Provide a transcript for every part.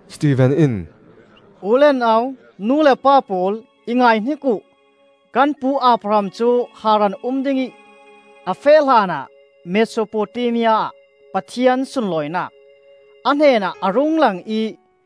Stefen in, “U le nau, nu le pa pawl, i ngaihnik uh! Kan pu Abraham cu Haran um dingih a feh hlanah Mesopotamia ah Pathian sunlawinak a hnenah a rung lang ih,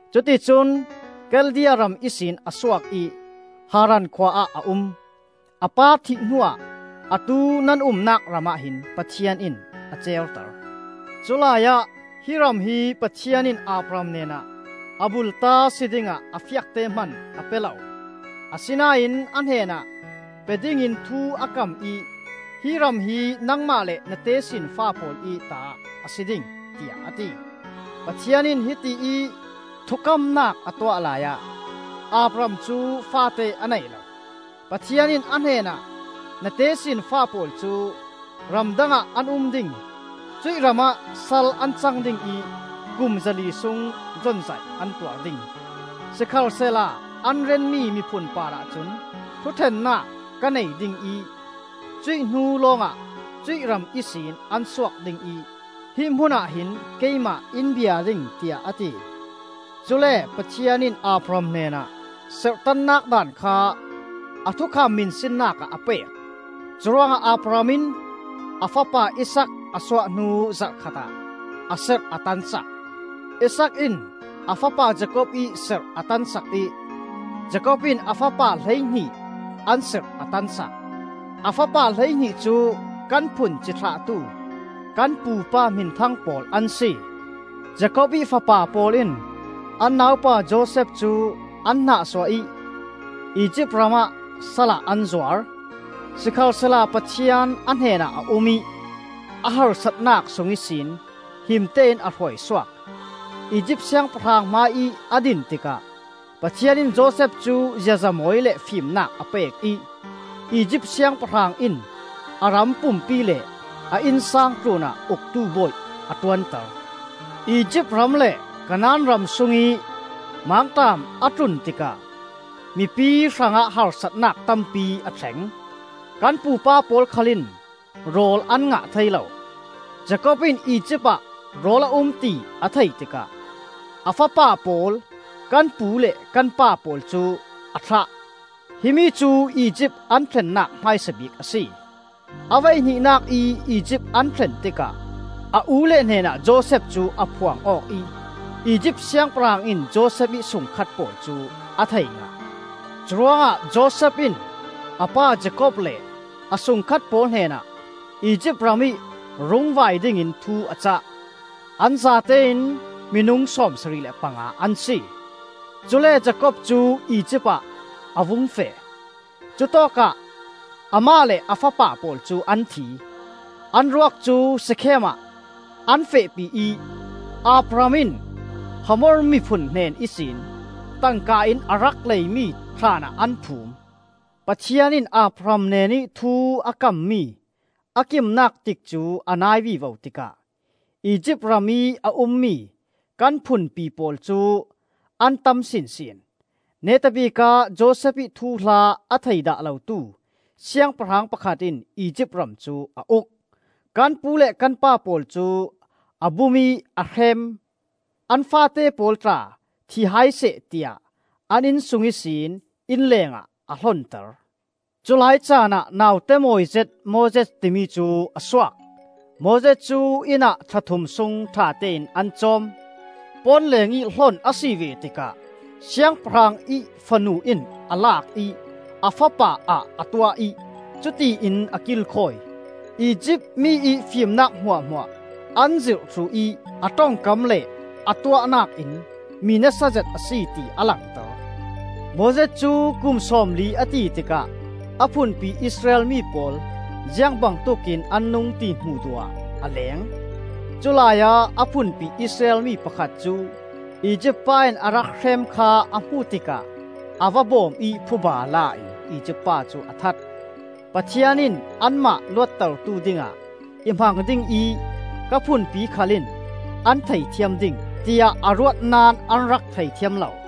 Cuti cun Khaldea ram ihsin a suak ih Haran khua ah a um. A pa thih hnuah atu nan umnak ramah hin Pathian in a certer. Culai ah hi ram hi Pathian in Abraham hnenah a bulta si dingah a fiakte hman a pe lo; asinain a hnenah pe dingin thu a kam ih hi ram hi nangmah le na tesinfa pawl ih ta a si ding, tiah a ti. Pathian in hiti ih thukamnak a tuah laiah Abraham cu faate a nei lo. Pathian in a hnenah, ‘Na tesinfa pawl cu ramdang ah an um ding; cuih ramah sal an cang ding ih kum zali sung zonzaih an tuar ding. Sikhalsehla an renmi miphun parah cun thuṭhennak ka nei ding ih cuih hnu lawngah cuih ram ihsin an suak ding ih hi hmunah hin keimah in bia ding,’ tiah a ti. Cule Pathian in Abraham hnenah serhtannak daan kha a thukam hminsinnakah a pek. Curuangah Abraham in a fapa Isaak a suah hnu zarh khatah a serh a tansak. Isaak in a fapa Jakob ih serh a tansak ih Jakob in a fapa hleihnih an serh a tansak. A fapa hleihnih cu kan phun cithlahtu kan pupa hminthang pawl an si. “Jakob ih fapa pawl in an naupa Josef cu an nahsuah ih Izipt ramah salah an zuar. Sikhalsehla Pathian a hnenah a um ih, a harsatnak sung ihsin himte in a hruai suak. Izipt siangpahrang hmaiih a din tikah Pathian in Josef cu ziaza mawi le fimnak a pek ih Izipt siangpahrang in a ram pumpi le a innsang tlunah uktu bawi a ṭuanter. Izipt ram le Kanaan ram sungih mangṭam a tlun tikah mipi hrangah harsatnak tampi a thleng. Kan pupa pawl khal in rawl an ngah thei lo. Jakob in Izipt ah rawl a um ti a theih tikah a fapa pawl, kan pu le kan pa pawl cu a thlah; himi cu Izipt an thlennak hmaisa bik a si. A voihnihnak ih Izipt an thlen tikah a u le hnenah Josef cu a phuang aw ih Izipt siangpahrang in Josef ih sungkhat pawl cu a thei ngah. Curuangah Josef in a pa Jakob le a sungkhat pawl hnenah Izipt ramih rung vai dingin thu a cah. An zatein minung sawmsarih le panga an si. Cule Jakob cu Izipt ah a vung feh; cutawkah amah le a fapa pawl cu an thi. An ruak cu Shekhem ah an fehpi ih Abraham in Hamor miphun hnen ihsin tangka in a rak leimi thlaan ah an phum. “Pathian in Abraham hnenih thu a kammi a kimnak tikcu a nai vivo tikah Izipt ramih a ummi kan phunpi pawl cu an tam sinsin. Neta bikah Josef ih thuhla a thei dah lotu siangpahrang pakhat in Izipt ram cu a uk. Kan pu le kan pa pawl cu a bum ih a hrem; an faate pawl tla thi hai seh tiah an innsung ihsin inn lengah a hlonter. Culai caanah naute mawi zet Moses timi cu a suak. Moses cu inn ah thla thum sung ṭhatein an cawm. Pawnleng ih hlon a si ve tikah siangpahrang ih fanu in a lak ih a fapa ah a tuah ih cutiin a kilkhawi. Izipt mi ih fimnak hmuahhmuah an zirh thluh ih a ṭongkam le a tuahnak in mi nasazet a si ti a langter. “Moses cu kum sawmli a ti tikah a phunpi Israel mi pawl ziang bangtuk in an nung, ti hmuh duh ah a leng. Culai ah a phunpi Israel mi pakhat cu Izipt pa in a rak hrem kha a hmu tikah a va bawm ih phuba la in Izipt pa cu a that. (Pathian in anmah luattertu dingah i hmang ding ih ka phunpi khal in an theithiam ding, tiah a ruat naón an rak theithiam lo.)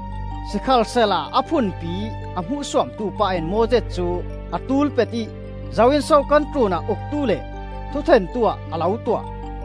Sikhalsehla a phunpi a hmuhsuamtu pa in Moses cu a tulpet ih, ‘Zo in so kan tlunah uktu le thuṭhentu ah a lo tuah?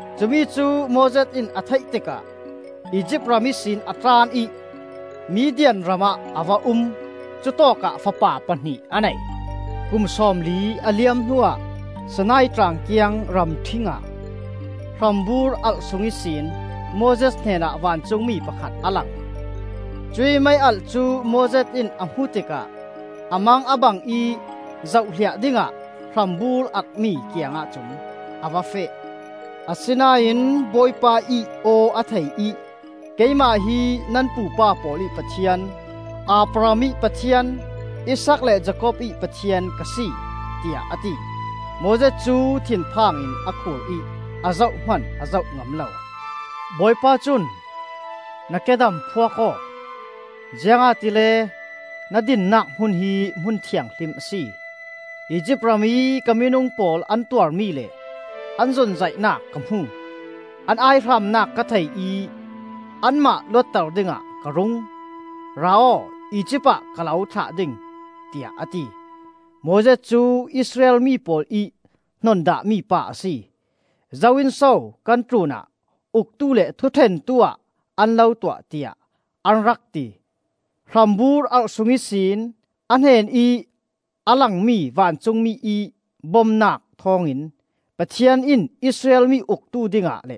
Cumi cu Moses in a theih tikah Izipt ram ihsin a tlan ih Midian ramah a va um. Cutawkah fapa pahnih a nei. “Kum sawmli a liam hnuah Sinai Tlang kiang ramṭhing ah hrambur alh sung ihsin Moses hnenah vancungmi pakhat a lang. Cuih mei alh cu Moses in a hmuh tikah a mang a bang ih zohhliah dingah hrambur alh-mi kiangah cun a va feh. Asinain Bawipa ih aw a thei ih, ‘Keimah hi nan pupa pawl ih Pathian, Abraham ih Pathian, Isaak le Jakob ih Pathian ka si,’ tiah a ti. Moses cu thinphang in a khur ih a zoh hman a zoh ngam lo. Bawipa cun, ‘Na kedam phuak aw, ziangahtile na dinnak hmun hi hmun thianghlim a si! Izipt ramih ka minung pawl an tuarmi le an zonzaihnak ka hmu. An aihramnak ka thei ih anmah luatter dingah ka rung. Ra aw, Izipt ah ka lo thlah ding,’ tiah a ti. “Moses cu Israel mi pawl ih hnon dahmi pa a si. ‘Zo in so kan tlunah uktu le thuṭhentu-ah an lo tuah?’ tiah an rak ti. Hrambur alh sung ihsin a hnenih a langmi vancungmi ih bomnak thawngin Pathian in Israel mi uktu dingah le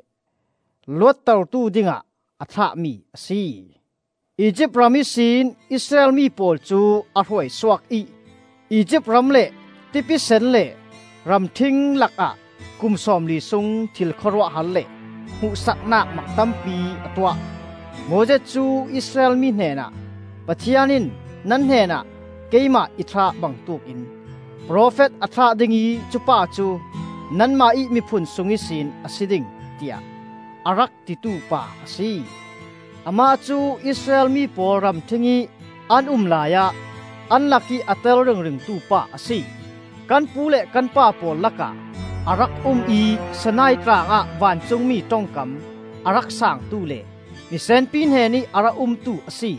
luattertu dingah a thlahmi a si. Izipt ram ihsin Israel mi pawl cu a hruaisuak ih Izipt ram le Tipi Sen le ramṭhing lakah kum sawmli sung thil khawruahhar le hmuhsaknak mak tampi a tuah. Moses cu Israel mi hnenah, ‘Pathian in nan hnenah keimah i thlah bangtuk in profet a thlah ding ih cupa cu nanmah ih miphun sung ihsin a si ding,’ tiah a rak titu pa a si. Amah cu Israel mi pawl ramṭhingih an um laiah an lakih a tel ringringtu pa a si; kan pu le kan pa pawl lakah a rak um ih Sinai Tlangah vancungmi ṭongkam a rak sangtu le misenpi hnenih a rak umtu a si;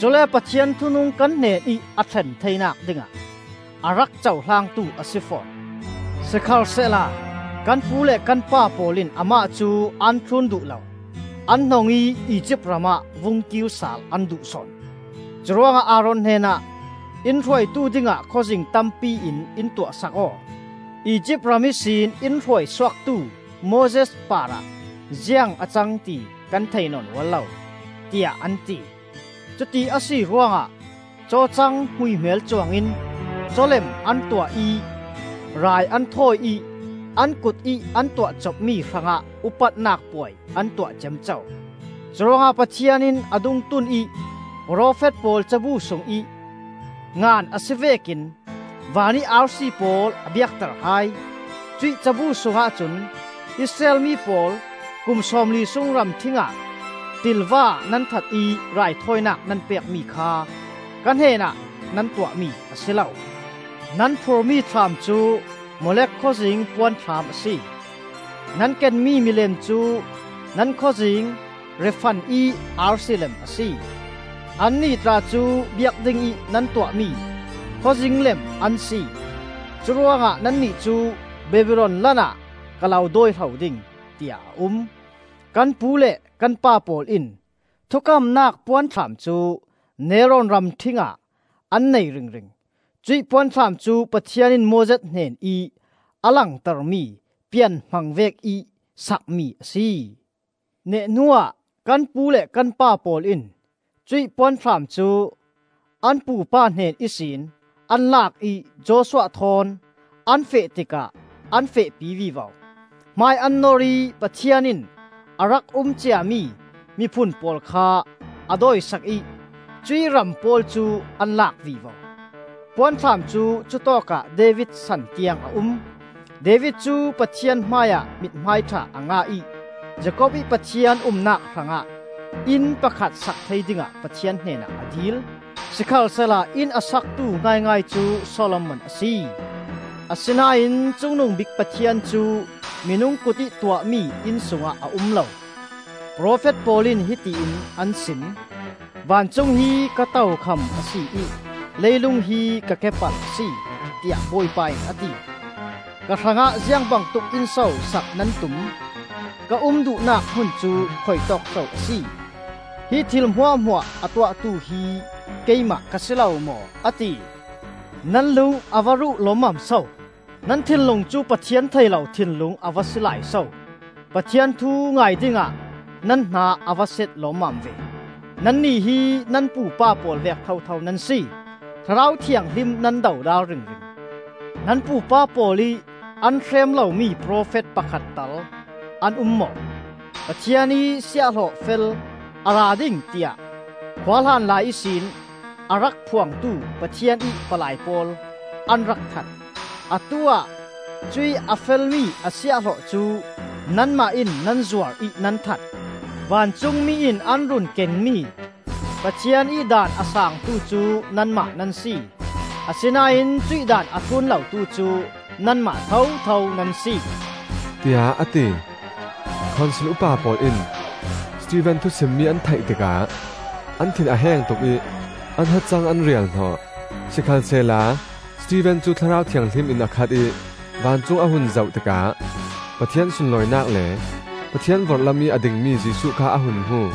cule Pathian thunung kan hnenih a thlen theinak dingah a rak cohlangtu a si fawn. “Sikhalsehla kan pu le kan pa pawl in amah cu an thlun duh lo. An hnong ih Izipt ram ah vung kirsal an duh sawn. Curuangah Aaron hnenah, ‘In hruaitu dingah khawzing tampi in in tuahsak aw. Izipt ram ihsin in hruaisuaktu Moses parah ziang a cang ti kan thei nawn ual lo,’ tiah an ti. Cuti a si ruangah cawcang hmuihmel cuangin caw lem an tuah ih rai an thawi ih an kutih an tuahcopmi hrangah upatnak puai an tuah ciamco. Curuangah Pathian in a dungtun ih profet pawl cabu sungih ngan a si vekin vanih arsi pawl a biakter hai. Cuih cabu sungah cun: ‘Israel mi pawl, kum sawmli sung ramṭhing ah ṭilva nan that ih Raithawinak nan pekmi kha ka hnenah nan tuahmi a si lo. Nan phurhmi thlam cu Molek khawzing puanthlam a si. Nan kenmi milem cu nan khawzing Refan ih arsi lem a si. Annih tla cu biak dingih nan tuahmi khawzing lem an si. Curuangah nannih cu Babilon lan ah ka lo dawihlo ding,’ tiah a um. “Kan pu le kan pa pawl in Thukamnak Puanthlam cu nelrawn ramṭhing ah an nei ringring. Cuih Puanthlam cu Pathian in Moses hnenih a langtermi pianhmang vekih sakmi a si. Neh hnuah kan pu le kan pa pawl in cuih puanthlam cu an pu pa hnen ihsin an lak ih Joshua thawn an feh tikah an fehpi vivo; hmai an nor ih Pathian in a rak um ciami miphun pawl kha a dawisak ih cuih ram pawl cu an lak vivo. Puanthlam cu cutawkah David san tiang a um. David cu Pathian hmaiah mithmai ṭha a ngah ih Jakob ih Pathian umnak hrangah inn pakhat sak thei dingah Pathian hnenah a dil. Sikhalsehla inn a saktu ngaingai cu Solomon a si. “Asinain Cungnungbik Pathian cu minung kutih tuahmi inn sungah a um lo; Profet pawl in hiti in an sim: ‘Vancung hi ka tokham a si ih Leilung hi ka kepal a si, tiah Bawipa in a ti. Ka hrangah ziangbangtuk inn so sak nan tum? Ka um duhnak hmun cu khuitawk so a si? Hi thil hmuahhmuah a tuahtu hi Keimah ka si lo maw?’ a ti. “Nan lung a va ruh lawmmam so! Nan thinlung cu Pathian thei lo thinlung a va si lai so! Pathian thu ngai dingah nan hna a va set lawmmam ve! Nannih hi nan pupa pawl vek thotho nan si: Thlarau Thianghlim nan dodal ringring! Nan pupa pawl ih an hrem lomi profet pakhat tal an um maw? Pathian ih Siahhlawh fel a ra ding tiah khuahlan lai ihsin a rak phuangtu Pathian ih palai pawl an rak that. Atu-ah cuih a felmi a Siahhlawh cu nanmah in nan zuar ih nan that! Vancungmi in an run kenmi Pathian ih daan a saangtu cu nanmah nan si; asinain cuih daan a thlun lotu cu nanmah thotho nan si,” tiah a ti. Khonsil upa pawl in Stefen thusimmi an theih tikah an thin a heng tuk ih an hacang an rial hnawh. Sikhalsehla Stefen cu Thlarau Thianghlim in a khat ih vancung a hun zoh tikah Pathian sunlawinak le Pathian vorhlamih a dingmi Jesuh kha a hun hmu.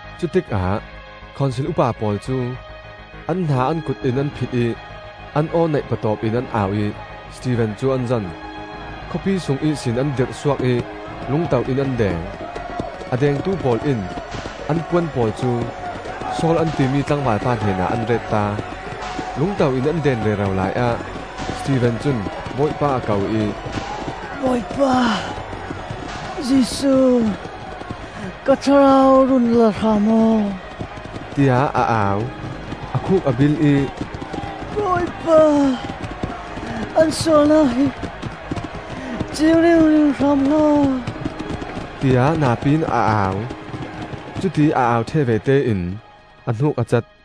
Cutikah Khonsil upa pawl cu an hna an kut in an phit ih an aw neih patawp in an au ih Stefen cu an zon! Khawpi sung ihsin an dirhsuak ih lungto in an deng. A dengtu pawl in an puan pawl cu Saul an timi tlangvalpa hnenah an retta. Lungto in an den rero laiah Stefen cun Bawipa a ko ih, “Bawipa Jesuh, ka thlarau run la hram aw!” tiah a au. A khuk a bilh ih, “Bawipa, an sualnak hi ciing ringring hram hlah aw!” tiah napi in a au. Cutiih a au ṭheh vete in a hnuk a cat.